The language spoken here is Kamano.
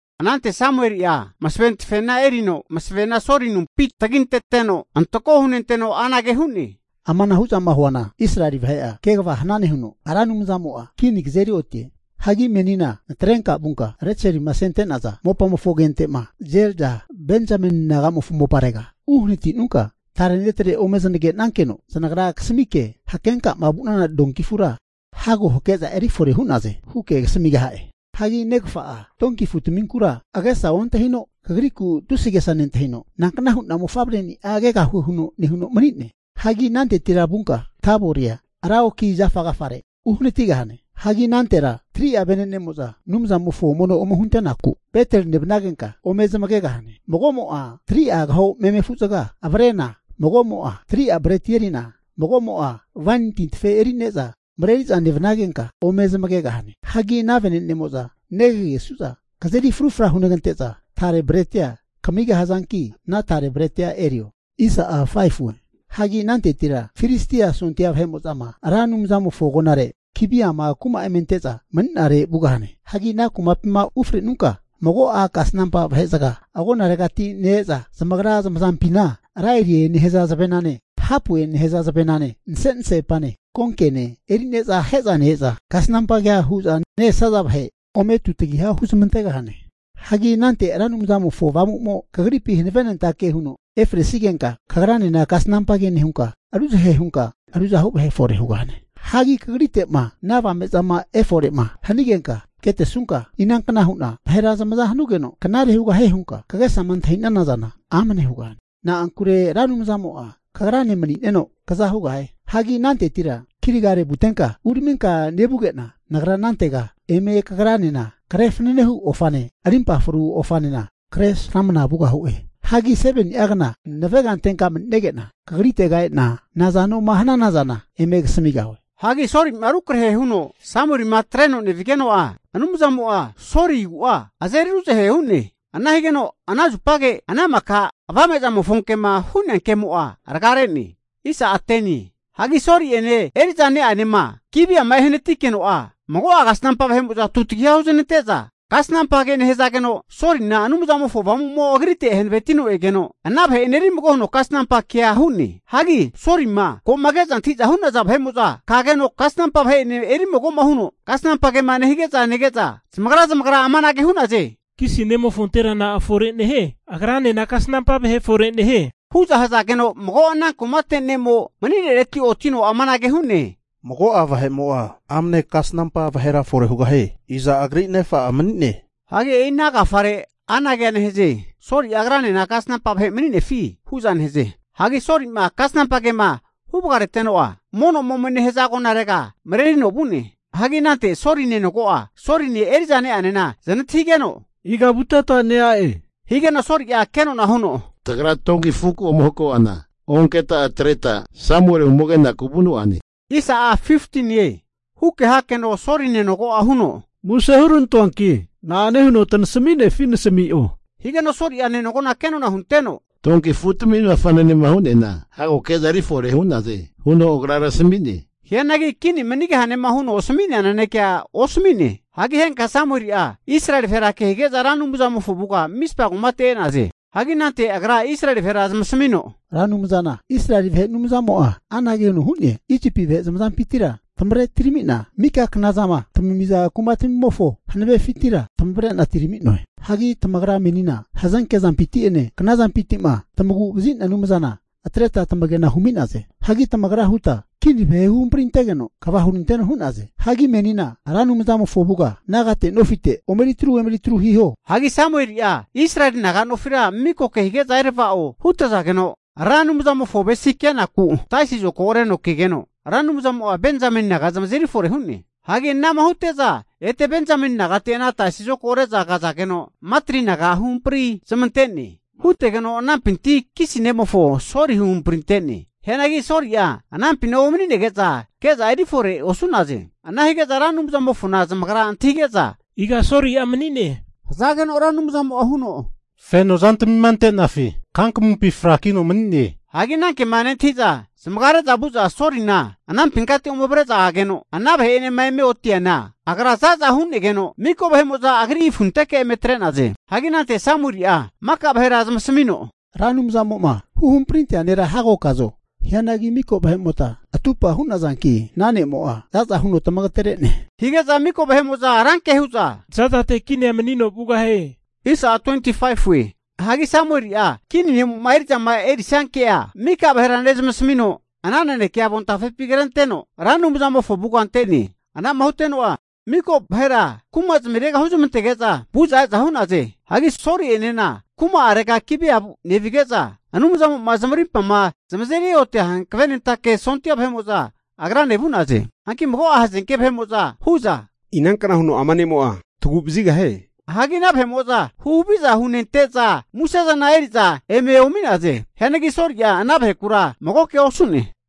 Anante Samueli'a masave tafena erino masavena Soli anumpi taginteteno, antako hunenteno anage hu'ne, Amanahu'zama huana, Israeli vahe'a kegava hanane huno Ra Anumzamo'a kini kazeri otie. Hagi menina natrenka vunka Reselima asente'naza mopamofo agente'ma Zelza Benzameni naga'mofo moparega uhanati'nunka, tare netre ome zanagenakeno, zanagra kasamike hakenkama vu'nana donki afura hago hake'za eri fore hu'naze huke kasamigaha'e. Hagi negafa'a donki afutaminkura agesa ontahino, kagriku tusi agesa nentahino, nankna hu'na mofavreni'a kegahue huno nehuno mani'ne. Hagi anantetira vunka Taboria ra oki zafa agafare uhanatigahane. Hagi anantera 3'a vene'nemo'za Anumzamofo mono ome hunte'naku Beteli nevanagenka ome zanagegahane. Magomo'a 3'a agaho meme afu'zaga avrena, magomo'a 3'a breti erina, mago'mo'a waini tintafe eri'ne'za mareri'za nevanagenka ome zamagegahane. Hagi ana venenemo'za negagesu'za kazeri frufra hunegante'za tare bretia kamigahazanki, ana tare bretia erio. Hagi anantetira Filistia sondia vahe'mo'zama Ra Anumzamofo agonare Gibeama kuma eme ante'za mani'nare vugahane. Hagi ana kumapima ufrenunka mago'a kasnampa vahezaga agonaregati ne-eza zamagra zamazampina laire nehaza zavenane hapue nehaza zavenane, nase'nasepane, konkene, eri'ne'za ahe'za ne-eza kasanampa kea hu'za ne-esaza vahe ome tutagiha huzmantegahane. Hagi anante Ra Anumzamofo Avamu'mo kagripi hanavenentake huno efresigenka, kagranena kasanampa ke nehunka, ruzahe hunka ruzahu vahe efore hugahane. Hagi kagrite'ma ana avame'zama efore'ma hanigenka ketesunka, inankna hu'na vahera zamazama hanugeno knare hugahie hunka kagesama antahi'nana zana, amane hugahane. Na'ankure Ra Anumzamo'a kagrane mani'neno kza hugahie. Hagi anantetira Gilgali vugotenka uraminka nevuge'na, Nagra anantega eme kagranena kre fanane hu ofane, rimpa fru ofanena kresramana vugahue. Hagi 7ni'a zagegna navegantenka mani'nege'na kagritega e'na nazanoma hanana zana eme kasamigahue. Hagi Soli'ma rukrahe huno Samuelima atreno nevigeno'a, Anumzamo'a Soli agu'a azeri ruzahe hu'ne. Ana higeno ana zupage ana maka avame'zamofo kema asami'nea kemo'a rgare'ne. Hagi Soli'ene eri'za ne'anema Gibiama ehanatikeno'a, mago'a kasnampa vahe'mo'za tutagiha huznante'za kasnampa ke nehazageno, Solina Anumzamofo Avamu'mo agrite hanavetino egeno, ana vahe'ene eri mago huno kasnampa kea hu'ne. Hagi Solima ko'ma ke'za antahi'za hu'naza vahe'mo'za kageno kasnampa vahe'ene erimago huno kasnampa kema nehige'za nege'za, zamagra zamagra amanage hu'naze, Kisi nemofontera na'a fore nehie? Agranena kasnampa vahe fore nehie. Hu'za hazageno mago ana kumate ne'mo mani'nereti otino amanage hu'ne, Mago'a vahe'mo'a amne kasnampa vahera fore hugahie. Iza agri nefa'a mani'ne. Hagi e'i ana agafare anagea nehaze, Soli'a agranena kasnampa vahe mani'nefi? hu'za nehaze. Hagi Soli'ma kasnampa kema huvagareteno'a, mono'ma ome nehaza agonarega marerino vu'ne. Hagi anante Soli nenogo'a Soline eri'za ne'anena zanantahigeno, iga vuteta nea'e? Higeno Soli'a kenona huno, tagra donki afuku ome hako'ana onketa atreta Samueli ome kenaku vu'noane. Huke hakeno Soli nenogo'a huno, muse huranantoanki na'ane huno tanasami'nefi nasami'o. Higeno Soli'a nenogona kenona hunteno, donki afu'tamina fanane hu'neana hago ke'za erifore hu'naze huno agra tasami'ne. Hianagi kini manigahanema huno asami'nea nanekea osami'ne. Hagi henka Samueli'a Israeli vahera ke hige'za Ra Anumzamofo avuga Mispa kumate e'naze. Hagi anante agra Israeli vahera zamasamino, Ra Anumzana Israeli vahe Anumzamo'a anage huno huama hie, Isipi vahe zamazampintira tamavre atiramina mareri'na ne-ena, mika knama tamamiza kuma'tamimofo hanavefintira tamavre'na atirami'noe. Hianagi tamagra menina hazenke zampinti'ene knazampinti'ma tamagu'vazi'nea Anumzana atreta tamage'na humi'naze. Hagi tamagra huta kini vahe huhamprintegeno kva huranteno hu'naze. Hagi menina Ra Anumzamofo avuga nagate nofite omeritru emeri tru hiho. Hagi Samueli'a Israeli naga nofira miko kehige'za erava'o hutazageno, Ra Anumzamofo avesi kenaku taisi zokago reno kegeno Ra Anumzamo'a Benzameni naga zamazeri fore hu'ne. Hagi anama hute'za ete Benzameni nagate ana taisi zokago re'za kazageno, Matri naga huhampri zamante'ne. Hutegeno anampinti Kisi nemofo Soli huhamprinte'ne. Hianagi Soli'a anampina omani'nege'za ke'za erifore osu'naze. Ana hige'za Ra Anumzamofona zamagra antahige'za, iga Soli'a mani'ne, hazageno Ra Anumzamo'a huno, fenozantamima ante'nafi kankamumpi frakino mani'ne. Hige'za ananke'ma nentahi'za zamagare'za vu'za Solina anampinkati ome avre'za ageno, ana vahe'enema eme oti'neana agra za'za hu'negeno miko vahe'mo'za agri afunteke eme atre'naze. Hagi anante Samueli'a maka vahera zamasamino, Ra Anumzamo'ma huhamprintea nera hago kazo? Hianagi miko vahe'mota atupa hu'nazanki ana ne'mo'a za'za huno tamagatere'ne, hige'za miko vahe'mo'za ranke hu'za, za'zate kinia manino vugahie. Hagi Samueli'a kini ne'mo'ma eri'zama erisia ke'a miko vahera nezamasamino, ana naneke avontafepi krenteno Ra Anumzamofo avuga ante'ne. Anama huteno'a miko vahera kuma'zmirega huzmantege'za vu'za e'za hu'naze. Hagi Soli'enena kuma'arega Gibea nevige'za, Anumzamo'ma zamarimpama zamazeri otia hanavenentake sondia vahe'mo'za agrane vu'naze. Hianagi mago'a hazenke vahe'mo'za hu'za, inankna huno ama ne'mo'a tagu'vazigahie. Hagi ana vahe'mo'za huhaviza hunente'za musezana eri'za eme omi'naze. Hianagi Soli'a ana vahekura mago kea osu'ne.